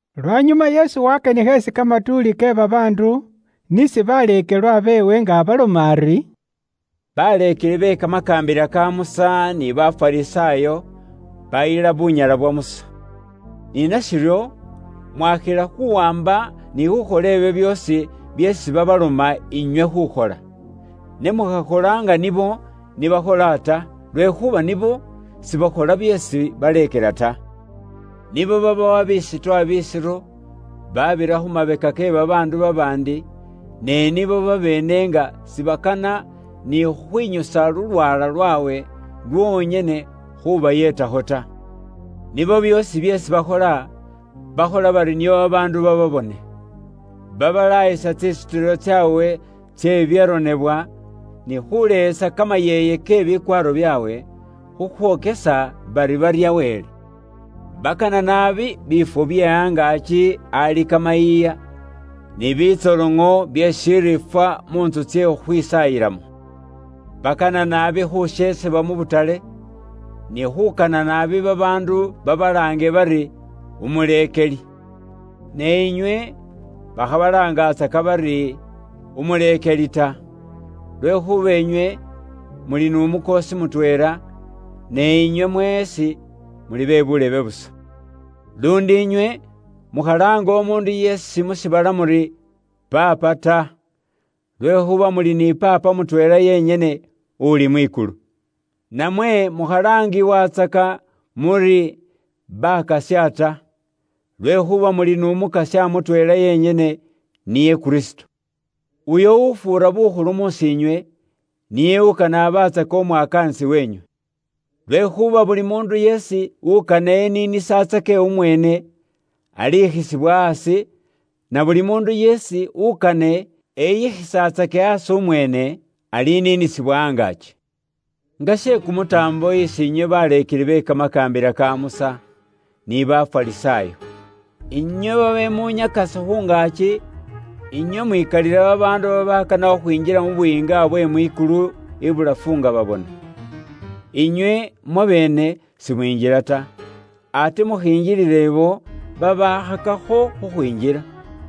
Lwanyuma Yesu waakanikha isi kamatuuli ke babaandu ni isi baleekelwa beewe, nga abaloma ari, “Baleekeli be kamakaambila ka Musa ni Bafarisaayo baayila bunyala bwa Musa. Ni nashiryo mwaakhila khuwaamba ni khuukhola ibyo byoosi byeesi babaloma inywe khuukhola. Ne mukhakhola nga nibo ni bakhola ta, lwekhuuba nibo sibakhola byeesi baleekela ta. Nibo babowa bisutwa bisiro, baabira khu mabeka ke babaandu babaandi, ne nibo babeene nga sibakana ni khukhwinyusa lulwaala lwaabwe lwonyene khuubayeetakho ta. “Nibo byoosi byeesi bakhola, bakhola bari nio babaandu bababone. Babalaayisa tsisutilo tsaabwe tse bibyaronebwa ni khuuleyesa kamayeeye ke bikwaaro byaabwe khukhwokesa bari barya Wele. Bakana naabi biifwo bye angaaki ali kamayiiya, ni bitsoloŋo bye shiriifwa mu ntsu tsye khukhwisaayilamo. Bakana naabi khusheesebwa mu butale, ni khuukana naabi babaandu babalaange bari, umuleekeli. “Ne inywe bakhabalaangatsaka bari, umuleekeli ta, lwekhuuba inywe muli n'Umukoosi mutweela, ne inywe mweesi muli be buulebe busa. Luundi inywe mukhalaanga umuundu yeesi mu shiibala muri, ‘Paapa’ ta, lwekhuuba muli ni Paapa mutweela yenyene uli mwikulu. Namwe mukhalaangiwatsaka muri ‘Bakasya’ ta, lwekhuuba muli n'Umukasya mutweela yenyene niye Kristo. Uyo ufuura bukhulu mus'iinywe, niye ukane abatsake umwakaanisi weenywe. Lwekhuuba buli muundu yeesi ukane eniinisatsake umweene, alikhisibwa aasi, na buli muundu yeesi ukane eyikhisatsake aasi umweene, aliniinisibwa angaaki.” “Nga she kumutaambo isi inywe baleekeli be kamakaambila ka Musa, ni Bafarisaayo. Inywe babemunyakasa khu ngaaki, inywe mwikalilila babaandu babaakana khukhwinjila mu Buyiinga bwe mwikulu ibulafu nga babona. Inywe mwabeene simwinjila ta, ate mukhingilila ibo babaakhakakho khukhwinjila.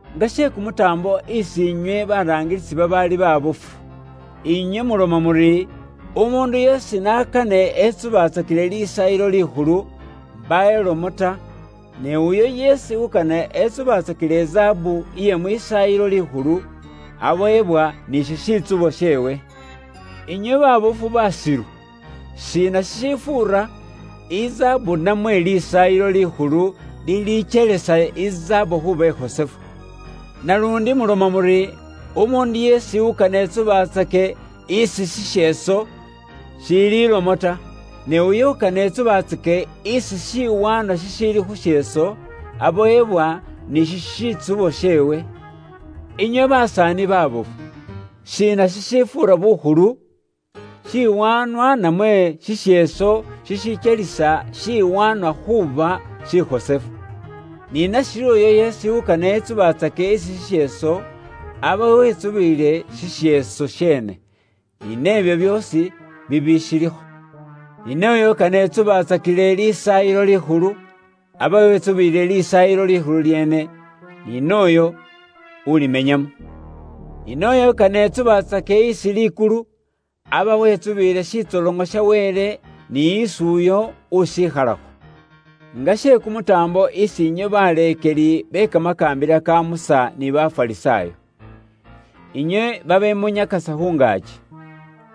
“Nga she kumutaambo isi inywe baraangilisi babaali baabofu! Inywe muloma muri, ‘Umuundu yeesi n'akane etsubatsakile Lisaayilo Likhulu, mbaawo ilomo ta, ne uyo yeesi ukane etsubatsakile izaabu iye mwisaayilo likhulu, abowebwa ni shishitsubo sheewe.’ Inywe baabofu baasilu! Shiina shishifuura; izaabu namwe Lisaayilo Likhulu lilikyelisa izaabu khuuba ikhosefu? Naluundi muloma muri, ‘Umuundu yeesi ukane etsubatsake isi shisheeso, shiili lomo ta, ne uyo ukane etsubatsake isi shiwaanwa shishiili khu sheeso, abowebwa ni shishitsubo sheewe.’ Inywe basaani baabofu! Shiina shishifuura bukhulu? Shiwaanwa namwe shisheeso shishikyelisa shiwaanwa khuuba shikhosefu? Ni nashiryo uyo yeesi ukane etsubatsake isi shisheeso, aba wetsubiile shisheeso sheene, ni nebyo byoosi bibishilikho. Ni nooyo ukane etsubatsakile Lisaayilo Likhulu, aba wetsubiile Lisaayilo Likhulu lyeene, ni nooyo ulimenyamo. Ni nooyo ukane etsubatsake isi likulu, aba wetsubiile shitsoloŋo sha Wele ni isi uyo ushikhalakho. “Nga she kumutaambo isi inywe baleekeli be kamakaambila ka Musa ni Bafarisaayo! Inywe babemunyakasa khu ngaaki!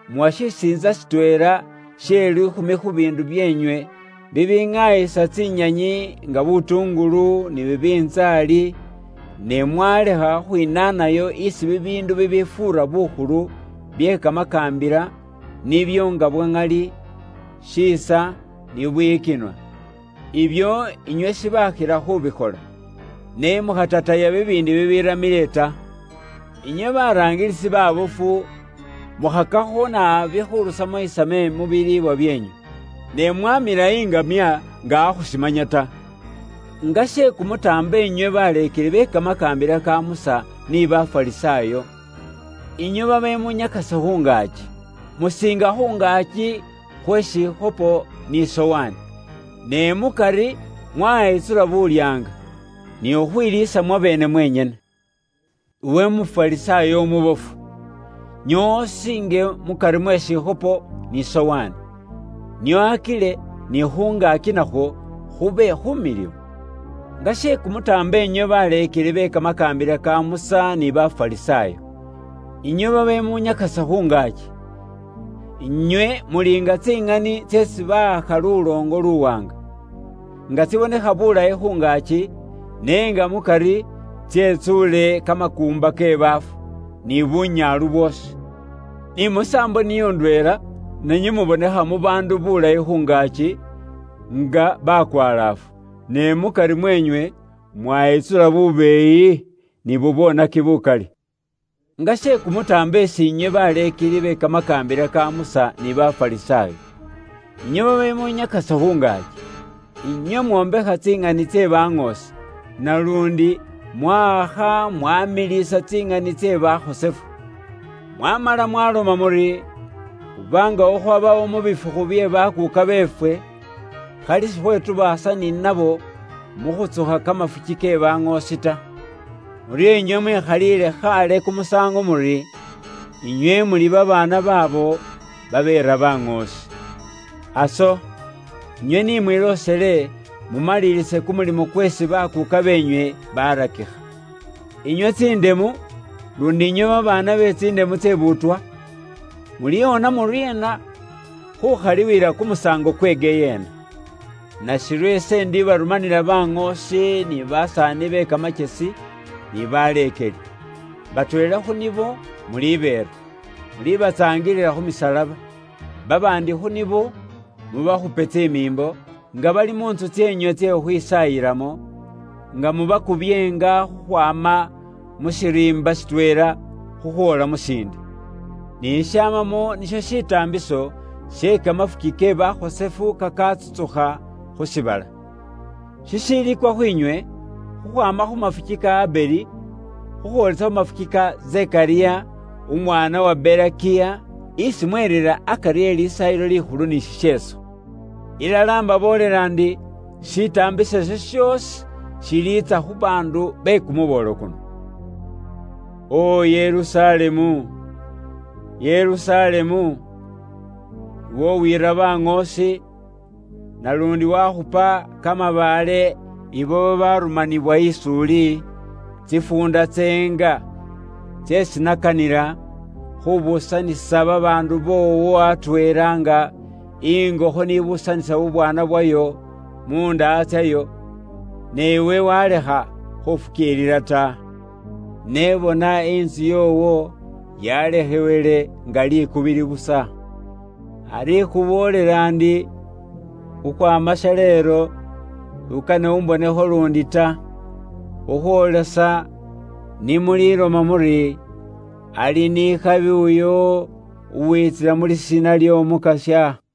Muwa shisiintsa shitweela she liikhumi khu biindu byeenywe bibiŋaayisa tsinyanyi nga butuungulu, ni bibintsaali, ne mwalekha khwinaanayo isi bibiindu bibifuura bukhulu bye kamakaambila, nga nibyo bwa ŋali, shiisa, bubwiyikinwa ni khufukiilila. Bino muli ni khubikhola, ne se shimanyisa shiri muli ni khutataya bibiindi bibiramile ta. Inywe baraangilisi baabofu, mukhakakho naabi khurusamo isame mu biliibwa byeenywe, ne mwamila iŋamya nga akhushimanya ta. “Nga she kumutaambo inywe baleekeli be kamakaambila ka Musa ni Bafarisaayo! Inywe babemunyakasa khu ngaaki! Musiinga khu ngaaki khwe shikhopo ni sowaani, ne mukari mwayitsula bulyaanga, ni khukhwiiliisa mwabeene mwenyene! Iwe Umufarisaayo umubofu! Nyoowa usiinge mukari mwe shikhopo ni sowaani, nio akile ni khu ngaaki nakhwo khube khumiliwu. “Nga she kumutaambo inywe baleekeli be kamakaambila ka Musa ni Bafarisaayo! Inywe babemunyakasa khu ngaaki! Inywe muli nga tsiŋani tseesi bawakha luloongo luwaanga, nga tsibonekha bulayi khu ngaaki, ne nga mukari tsetsuule kamakuumba ke baafu, ni bunyaalu bwoosi. Ni musaambo niyo ndweela, nanywe mubonekha mu baandu bulayi khu ngaaki, nga bakwalaafu, ne mukari mweenywe mwayitsula bubeeyi, ni bubwoonaki bukali. “Nga she kumutaambo isi inywe baleekeli be kamakaambila ka Musa ni Bafarisaayo! Inywe babemunyakasa khu ngaaki! Inywe mwombekha tsiŋani tse baŋoosi, naluundi mwawakha mwamiliisa tsiŋani tse bakhosefu. Mwamala mwaloma muri, ‘Khuba nga khukhwabawo mu bifukhu bye bakuuka beefwe, khali sikhwetubaasa ni nabo mu khutsukha kamafuki ke baŋoosi ta.’ Muryo inywe mwekhaliile khaale kumusaango muri, inywe muli babaana baabo babeera baŋoosi. Aso, inywe ni mwiloosele mumalilise kumulimo kweesi bakuuka beenywe barakikha! “Inywe tsindemu! Luundi inywe babaana be tsindemu tse buutwa! Muliwona muryeena khuubakhalila kumusaango kwe kumulilo kukukhasima ta? Nashiryo ise indibarumanila baŋoosi ni basaani be kamakyesi, ni baleekeli. Batweela khu nibo mulibeera, mubatsaangilile khu misalaba, babaandi khu nibo mubakhupe tsimiimbo nga bali mu ntsu tseenywe tse khukhwisaayilamo, nga mubakubyeenga khukhwaama mu shiriimba shitweela khukhwoola mu shiindi. Kim 24.20,21Ni shishamamo nisho shitaambiso she kamafuki ke bakhosefu kakatsutsukha khu shiibala, shishiliikwa khwiinywe, khukhwaama khu mafuki ka Abeli, khukhwoolesa khu mafuki ka Zekariya, umwaana wa Berekiya, isi mwerira akari e Lisaayilo Likhulu ni shisheeso. Ilala imbaboolela ndi, shitaambiso isho shoosi shiliitsa khu baandu be kumuboolo kuno.” “O Yerusalemu, Yerusalemu! Iwe uwiira baŋoosi, naluundi wakhupa kamabaale ibo babarumaniwa is'uli, tsifuunda tseenga tseesi nakanila khubuusanisa babaandu boowo atweela nga ingokho ni buusanisa bubwaana bwayo mu ndaha tsayo, ne iwe walekha khufukiilila ta! Ne bona intsu yoowo yalekhewele nga likubili busa. Ari ikhuboolela ndi, khukhwaama shaleelo, s'ukane umbonekho luundi ta, khukhwoolesa ni muliloma muri, ‘Ali ni khabi uyo uwiitsila mu lisiina ly'Omukasya.’”